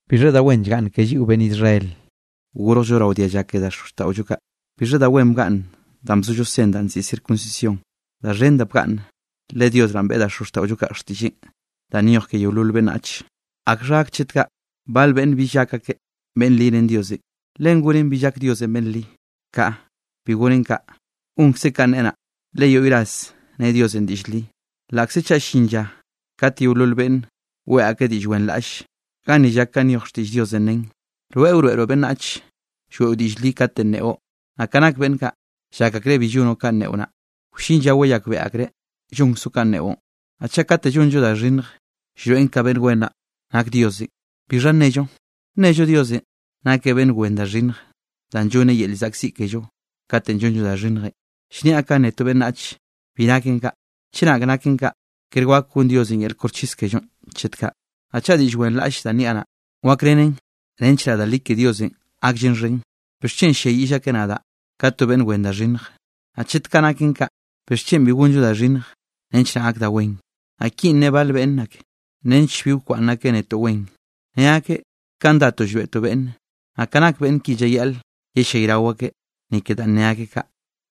¿Bixha da wen llgaꞌnn ke lliꞌo beꞌnn Israel, gorjllo rao dialla ke xozxtaꞌollo kaꞌ? ¿Bixha da wen bgaꞌnn danꞌ bzollo sen danꞌ nziꞌi circuncisión? Da xhen da bgaꞌnne. Le Dios naꞌ beꞌe da xozxtaꞌollo kaꞌ xtiꞌlleꞌ danꞌ nyoj ke yeolol beꞌnnach. ¿Akxha gak chet kaꞌ bal beꞌnne bill gak akeꞌ beꞌnn li ren Diosenꞌ? ¿Len gonen bill gak Diosenꞌ beꞌnn li? Kaꞌa, bi goneꞌ kaꞌ. Gonkzeꞌ kanꞌ neꞌe naꞌ, le yoꞌy ras ne Diosenꞌ diꞌll li, laꞌkze chaꞌ llin lla kate yeolol beꞌnne weꞌe akeꞌ diꞌll wenraꞌlle. Ganni llak kanꞌ nyoj xtiꞌll Diosenꞌ nen: Rweꞌ wroeꞌroꞌ beꞌnnach lloeꞌo diꞌll li katenꞌ nneꞌo. Naꞌ ka nak beꞌnn kaꞌ, llak akreꞌ bi llonoꞌ kanꞌ neꞌo naꞌ, wllin lla wayakbeꞌe akreꞌ llonkzoꞌ kanꞌ neꞌon. Naꞌ chaꞌ kate llonllo da xhinnj llroeꞌn ka beꞌnn wen nak Diosenꞌ, ¿bixha nnello? ¿Nnello Diosenꞌ nakeꞌ beꞌnn wen da xhinnj danꞌ llonneꞌ yel llzaꞌkziꞌ kello kate llonllo da xhinnjenꞌ? (Llniaꞌ kanꞌ ne to beꞌnnach.) Bi naken kaꞌ, chenak naken kaꞌ, ker wak gon Diosenꞌ yel koxchis kellonꞌ chet kaꞌ. Naꞌ chaꞌ diꞌll wenraꞌll danꞌ niaꞌ naꞌ, wakrenen nench naꞌ da li ke Diosenꞌ gakllen xhen, ¿bixchen ll-lliayiꞌll akeꞌ nadaꞌ ka to beꞌnn wen da xhinnj? Naꞌ chet kaꞌ naken kaꞌ, ¿bixchen bi gonllo da xhinnj nench naꞌ gak da wen? Naꞌ kinꞌ ne bal beꞌnn ake, nench bi wkwaꞌnn akeꞌ netoꞌ wen, ne akeꞌ kaꞌn datoꞌ llroeꞌtoꞌ beꞌnne. Naꞌ ka nak beꞌnn ki llayaꞌl yellayrao akeꞌ, ni ke danꞌ ne akeꞌ kaꞌ.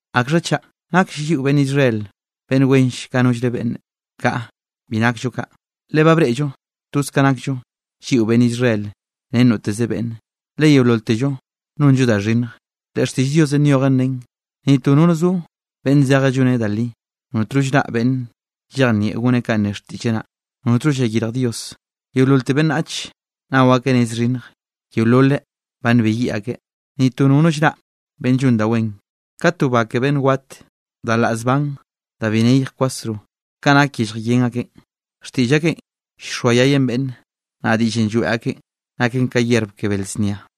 ¿Akxha chaꞌ? ¿Naklle lliꞌo beꞌnn Israel beꞌnn wenlle ka nollre beꞌnne? Kaꞌa, bi nakllo kaꞌ. Le ba breꞌllo toz ka nakllo lliꞌo beꞌnn Israel ren noteze beꞌnne, le yeololtello nonllo da xhinnj. Le xtiꞌll Diosenꞌ nyojen nen: Ni to nono zo beꞌnn zeje lloneꞌ da li. Notno llraꞌ beꞌnn llejnieꞌ goneꞌ kanꞌ ne xtiꞌlleꞌ naꞌ, notno llayirj Diosenꞌ. Yeololte beꞌnnach nao akeꞌ nez xhinnj, yeololeꞌ ba nbeyiꞌ akeꞌ. Ni to nono llraꞌ beꞌnn llon da wen. Ka to ba ke beꞌnn wat, da laꞌ zban da bi neyj kwasro, ka nak yellj yen akeꞌn, xtiꞌll akeꞌn llxoayayen beꞌnne, naꞌ diꞌllenꞌ lloeꞌ akeꞌn naken ka yerb ke bel znia.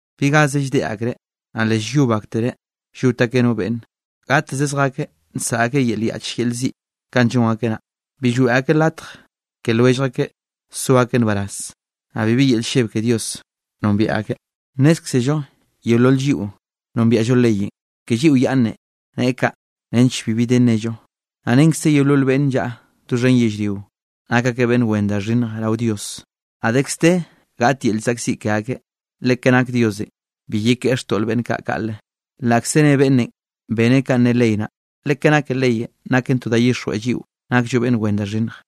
Bi gaze lldeꞌe akreꞌ, naꞌ le llyob aktereꞌ llot akeꞌ no beꞌnne. Gateze zjakeꞌ nsaꞌa akeꞌ yel yaꞌch yel ziꞌ kanꞌ llon akeꞌ naꞌ. Bi lloeꞌ akeꞌ latj ke lwellj akeꞌ so akeꞌ nbaraz. Naꞌ bibi yel lleb ke Diosenꞌ nombiaꞌ akeꞌ. Nnézkzello yeolol lliꞌo nombiaꞌllo leyenꞌ, ke lliꞌo yaꞌnnenꞌ nen kaꞌ nench bibi de nnello, naꞌ renkze yeolol beꞌnn llaꞌa doxhen yellrio, nak akeꞌ beꞌnn wen da xhinnj rao Dios, naꞌ dekz de gaꞌt yel llzaꞌkziꞌ ke akeꞌ. Le ke nak Diosenꞌ bi yekeꞌe xtoꞌl beꞌnn kaꞌ kaꞌle, laꞌkze nne beꞌnnenꞌ beneꞌ kanꞌ ne ley naꞌ, le ke nake leyenꞌ naken to da llyixjweꞌn lliꞌo nakllo beꞌnn wen da xhinnj.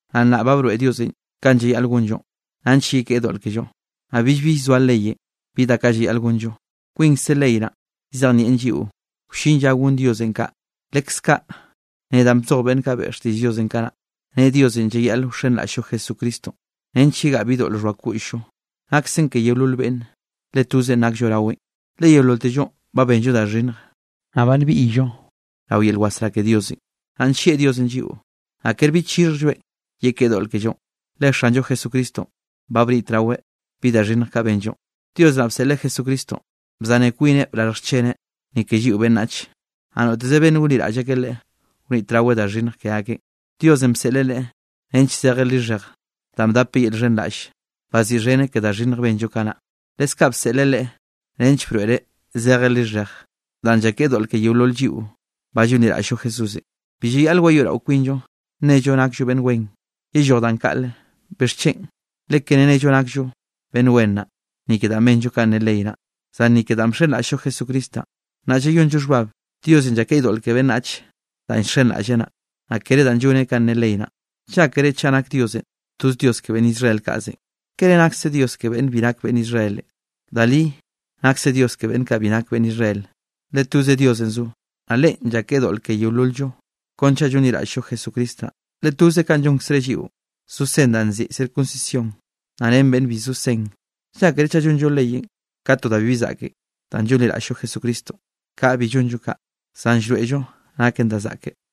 Naꞌ nnaꞌ ba broeꞌ Diosenꞌ kanꞌ llayaꞌl gonllo, nench yekeꞌe doꞌl kello, naꞌ billbi llzoa leyenꞌ bi da kaꞌ llayaꞌl gonllo. Kwinkze ley naꞌ llzejnieꞌn lliꞌo wllin lla gon Diosenꞌ kaꞌ, leskaꞌ ne danꞌ bzoj beꞌnn kaꞌ beꞌe xtiꞌlleꞌn kanaꞌ. Ne Diosenꞌ llayaꞌl wxenraꞌll-llo Jesucristonꞌ nench yegaꞌa bi doꞌl xhoa koꞌll-llo. Naksen ke yeolol beꞌnne, le tozenꞌ naksllo raweꞌn. Le yeololtellonꞌ ba benllo da xhinnje, naꞌ ba nbiꞌyllo rao yel wasrá ke Diosenꞌ. Naꞌ nllieꞌ Diosenꞌ lliꞌo, naꞌ kere bi chixhjlloeꞌn yekeꞌe doꞌl kellonꞌ, le Xanllo Jesucristonꞌ ba bnitraweꞌ bi da xhinnj kaꞌ benllo. Dios naꞌ bseꞌleꞌ Jesucristonꞌ bzaneꞌ kwineꞌ brarj xcheneꞌ, ni ke lliꞌo beꞌnnach. Naꞌ noteze beꞌnne gonliraꞌll akeꞌ Leꞌe, wnitraweꞌ da xhinnj ke akeꞌn. Diosenꞌ bseꞌleꞌ Leꞌe nench zeje lixhej danꞌ bdapeꞌ yel llxhenraꞌll, baziꞌxheneꞌ ke da xhinnj benllo kanaꞌ. Leskaꞌ bseꞌleꞌ Leꞌe nench broeꞌreꞌ zeje lixhej danꞌ llakeꞌe doꞌl ke yeolol lliꞌo ba llonliraꞌll-llo Jesúsenꞌ. Bi llayaꞌl wayoeꞌrao kwinllo nnello nakllo beꞌnn wen. ¡Yelloj danꞌ kaꞌle! ¿Bixchen? Le kere nello nakllo beꞌnn wen naꞌ, ni ke danꞌ benllo ka ne ley naꞌ, zan ni ke danꞌ bxenraꞌll-llo Jesucristo naꞌn. Naꞌ llayonllo xhbab, Diosenꞌ llakeꞌe doꞌl ke beꞌnnach danꞌ llxenraꞌlleꞌ naꞌ, naꞌ kere danꞌ lloneꞌ kanꞌ ne ley naꞌ. ¿Llákere chaꞌ nak Diosenꞌ toze Dios ke beꞌnn Israel kaꞌzenꞌ? ¿Kere nakse Dios ke beꞌnn bi nak beꞌnn Israel? Da li nakseꞌ Dios ke beꞌnn kaꞌ bi nak beꞌnn Israel. Le toze Diosenꞌ zo, naꞌ Leꞌen llakeꞌe doꞌl ke yeolol-llo, kon chaꞌ llonliraꞌll-llo Jesucristo naꞌ, le toze kaꞌn llónkzereꞌ lliꞌo, zo sen danꞌ nziꞌi circuncisión, naꞌ ren beꞌnn bi zo sen. ¿Llákere chaꞌ llonllo leyenꞌ ka to da bibi zaꞌken danꞌ llonliraꞌll-llo Jesucristonꞌ? Kaꞌa bi llonllon kaꞌ, zan llroeꞌllo naken da zaꞌke.